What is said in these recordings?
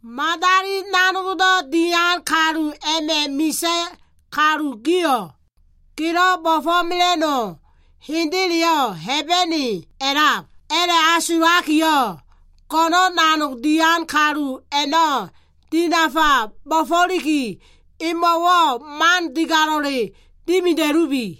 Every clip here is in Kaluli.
Madali nanogdo꞉ dian kalu a꞉ma꞉ misa꞉ kalu gio꞉, gelo꞉ bo꞉fo꞉mela꞉no꞉ hendeleyo꞉ Hebene a꞉lab a꞉la꞉asulakiyo꞉, go꞉no꞉n nanog dian kalu a꞉no꞉ dinafa bo꞉fo꞉liki, imo꞉wo꞉ man digalo꞉le dimida꞉lubi.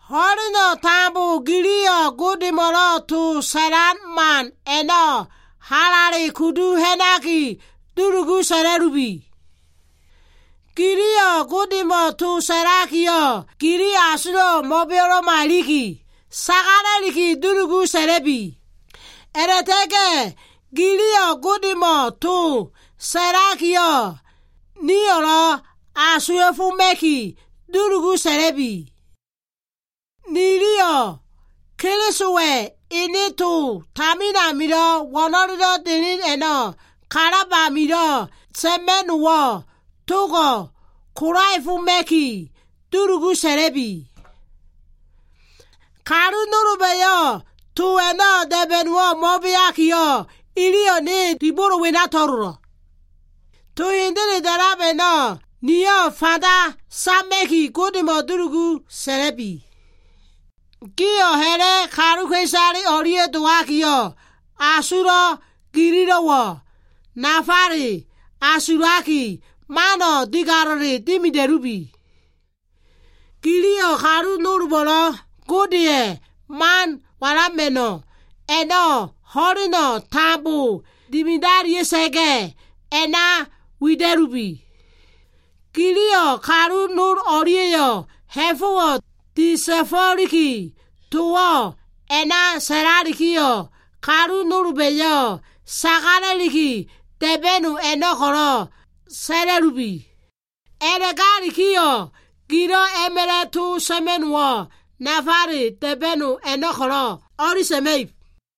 Ho꞉leno꞉ tambo giliyo꞉ Godemo꞉lo꞉ to sa꞉lan man a꞉no꞉ halale kudu ha꞉naki dulugu sa꞉la꞉lubi. Giliyo꞉ Godemo꞉ to sa꞉lakiyo꞉, gili asulo꞉wo꞉ mo꞉beo꞉lo꞉ma iliki, sagalaki dulugu sa꞉la꞉bi. A꞉la꞉ta꞉ga꞉ giliyo꞉ Godemo꞉ to sa꞉lakiyo꞉, niyo꞉lo꞉ asuwa꞉foma꞉ki dulugu sa꞉la꞉bi. Niliyo꞉ Kelisowa꞉ ene to tamin amilo꞉ wo꞉no꞉lelo꞉ delen a꞉no꞉ kalab amilo꞉ sa꞉ma꞉no꞉wo꞉ togo꞉ kolaefoma꞉kiyo꞉, dulugu sa꞉la꞉bi. Kalu nolba꞉yo꞉ to a꞉no꞉ da꞉ba꞉no꞉wo꞉ mo꞉beakiyo꞉ iliyo꞉ ne dibolo wena to꞉lolo꞉. To hendele da꞉lab a꞉no꞉ niyo꞉ fanda sama꞉ki Godemo꞉ dulugu sa꞉la꞉bi. Giyo꞉ ha꞉la꞉ kaluka꞉isale o꞉lia꞉ dowakiyo꞉, asulo꞉ gililo꞉wo꞉ nafale asulaki, mano꞉ digalo꞉le dimida꞉bi. Giliyo꞉ kalu nolbo꞉lo꞉ Godeya꞉ man walama꞉no꞉ a꞉no꞉ ho꞉leno꞉ tambo dimidalia꞉sa꞉ga꞉ a꞉na wida꞉lubi. Giliyo꞉ kalu nol o꞉lia꞉yo꞉ ha꞉fo꞉wo꞉ disa꞉fo꞉liki towo꞉ a꞉na sa꞉lakiyo꞉, kalu nolba꞉yo꞉ sagala꞉likilo꞉ da꞉ba꞉no꞉ a꞉no꞉ ko꞉lo꞉ sa꞉la꞉lubi. A꞉la꞉galikiyo꞉, gilo꞉ a꞉ma꞉la꞉ to sa꞉ma꞉no꞉wo꞉ nafale da꞉ba꞉no꞉ a꞉no꞉ ko꞉lo꞉ o꞉li sa꞉ma꞉ib.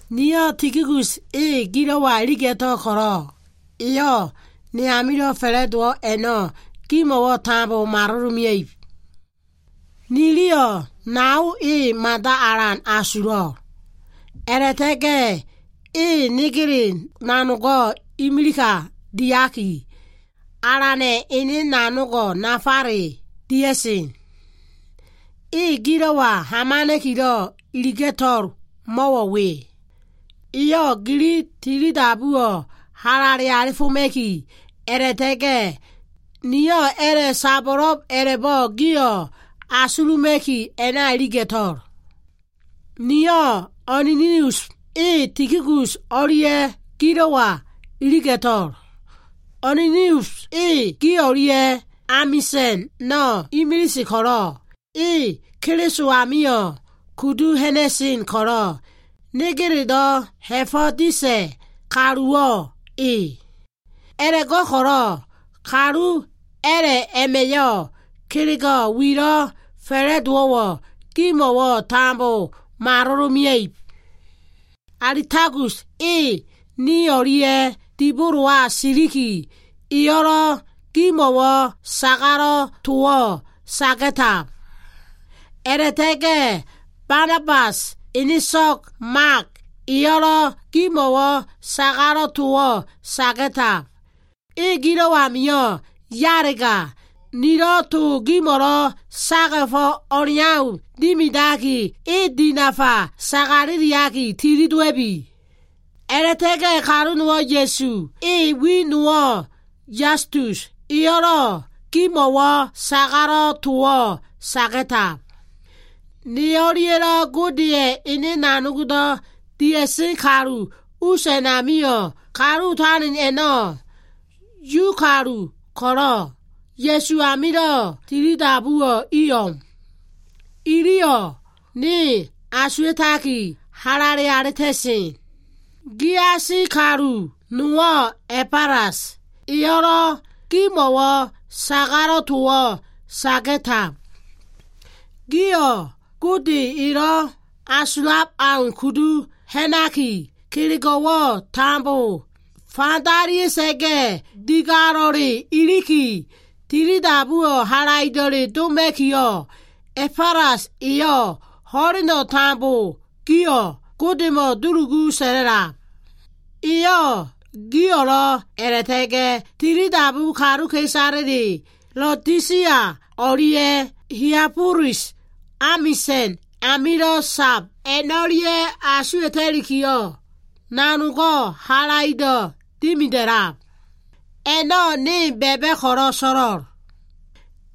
Niyo꞉ Tikikus e gilo꞉wa iliga꞉to꞉l ko꞉lo꞉, eyo꞉ ne amilo꞉ fa꞉la꞉dowo꞉ a꞉no꞉ gimo꞉wo꞉ tambo malolomea꞉ib. Niliyo꞉ nao e mada alan asulo꞉, a꞉la꞉ta꞉ga꞉ e negele nanogo꞉ imilika diaki, Alana꞉ ene nanogo꞉ nafale dia꞉sen. E gilo꞉wa hamana꞉kilo꞉ iliga꞉to꞉lo꞉ mo꞉wo꞉ we. Eyo꞉ gili tilidabuwo꞉ halale alifoma꞉ki, a꞉la꞉ta꞉ga꞉ nio꞉ a꞉la꞉ sabo꞉lo꞉b a꞉la꞉bo꞉ gio꞉ asuluma꞉ki a꞉na iliga꞉to꞉l. Niyo꞉ Onesimus e Tikikus o꞉lia꞉ gilo꞉wa iliga꞉to꞉l. Onesimus e gi o꞉lia꞉yo꞉ amisa꞉no꞉ imilise ko꞉lo꞉, e Keliso amio꞉ kudu ha꞉na꞉sen ko꞉lo꞉, negelelo꞉ ha꞉fo꞉ disa꞉ kaluwo꞉ e. A꞉la꞉go꞉ko꞉lo꞉ kalu a꞉la꞉ wema꞉yo꞉ kelego꞉ wilo꞉ fa꞉la꞉dowo꞉wo꞉ gimo꞉wo꞉ tambo malolomea꞉ib. Alistakus e ne o꞉lia꞉ dibolowa siliki, eyo꞉lo꞉ gimo꞉wo꞉ sagalo꞉ towo꞉ saga꞉tab. A꞉la꞉ta꞉ga꞉ Banabasa꞉ eneso꞉g Mak eyo꞉lo꞉ gimo꞉wo꞉ sagalo꞉ towo꞉ saga꞉tab. E gilo꞉ amio꞉ yalega, nilo꞉ to gimo꞉lo꞉ saga꞉fo꞉ o꞉leau dimidaki, e dinafa sagala꞉liki tilidowa꞉bi. A꞉la꞉ta꞉ga꞉ kalu nowo꞉ Ya꞉su, ene wi nowo꞉ Yastus, eyo꞉lo꞉ gimo꞉wo꞉ sagalo꞉ towo꞉ saga꞉tab. Ne o꞉lia꞉lo꞉ Godeya꞉ ene nanogdo꞉ dia꞉sen kalu us wenamio꞉, kalu otalen a꞉no꞉, Yu kalu ko꞉lo꞉, Ya꞉su amilo꞉ tilidabuwo꞉ i o꞉m. Iliyo꞉ ne asuwa꞉taki, halale alita꞉sen. Giasi kalu nowo꞉ Ebafelas eyo꞉lo꞉ gimo꞉wo꞉ sagalo꞉ towo꞉ saga꞉tab. Gio꞉ Gode elo꞉ asulab au kudu ha꞉naki, kelego꞉wo꞉ tambo fandalia꞉sa꞉ga꞉ digalo꞉le iliki, tilidabuwo꞉ halaido꞉le doma꞉kiyo꞉, Ebafelas eyo꞉ ho꞉leno꞉ tambo gio꞉ Godemo꞉ dulugu sa꞉la꞉lab. Eyo꞉ gio꞉lo꞉ a꞉la꞉ta꞉ga꞉ tilidabu kaluka꞉isale Laodisia o꞉lia꞉ Hialabolis amisa꞉n a꞉namilo꞉ sab a꞉no꞉lia꞉ asuwa꞉ta꞉likiyo꞉, nanogo꞉ halaido꞉ dimida꞉lab. A꞉no꞉ ne ba꞉ba꞉ ko꞉lo꞉ so꞉lo꞉l.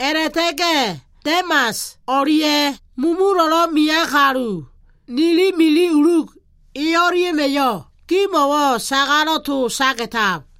A꞉la꞉ta꞉ga꞉ Demas o꞉lia꞉, mulumulo꞉lo꞉ mean kalu, nili mili Luk e o꞉lia꞉ma꞉yo꞉ gimo꞉wo꞉ sagalo꞉ towo꞉ saga꞉tab.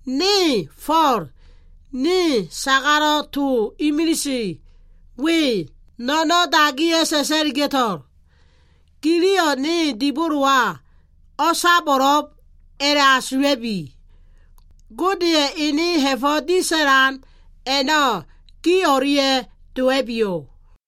Ne Fo꞉l, ni sagalo꞉ to imilise we, no꞉no꞉n dagiya꞉ sa꞉sa꞉liga꞉to꞉l. Giliyo꞉ ne dibolowa o꞉sabo꞉lo꞉b a꞉la꞉asula꞉bi. Godeya꞉ ene ha꞉fo꞉ disa꞉lan a꞉no꞉ gi o꞉lia꞉ dowa꞉biyo꞉.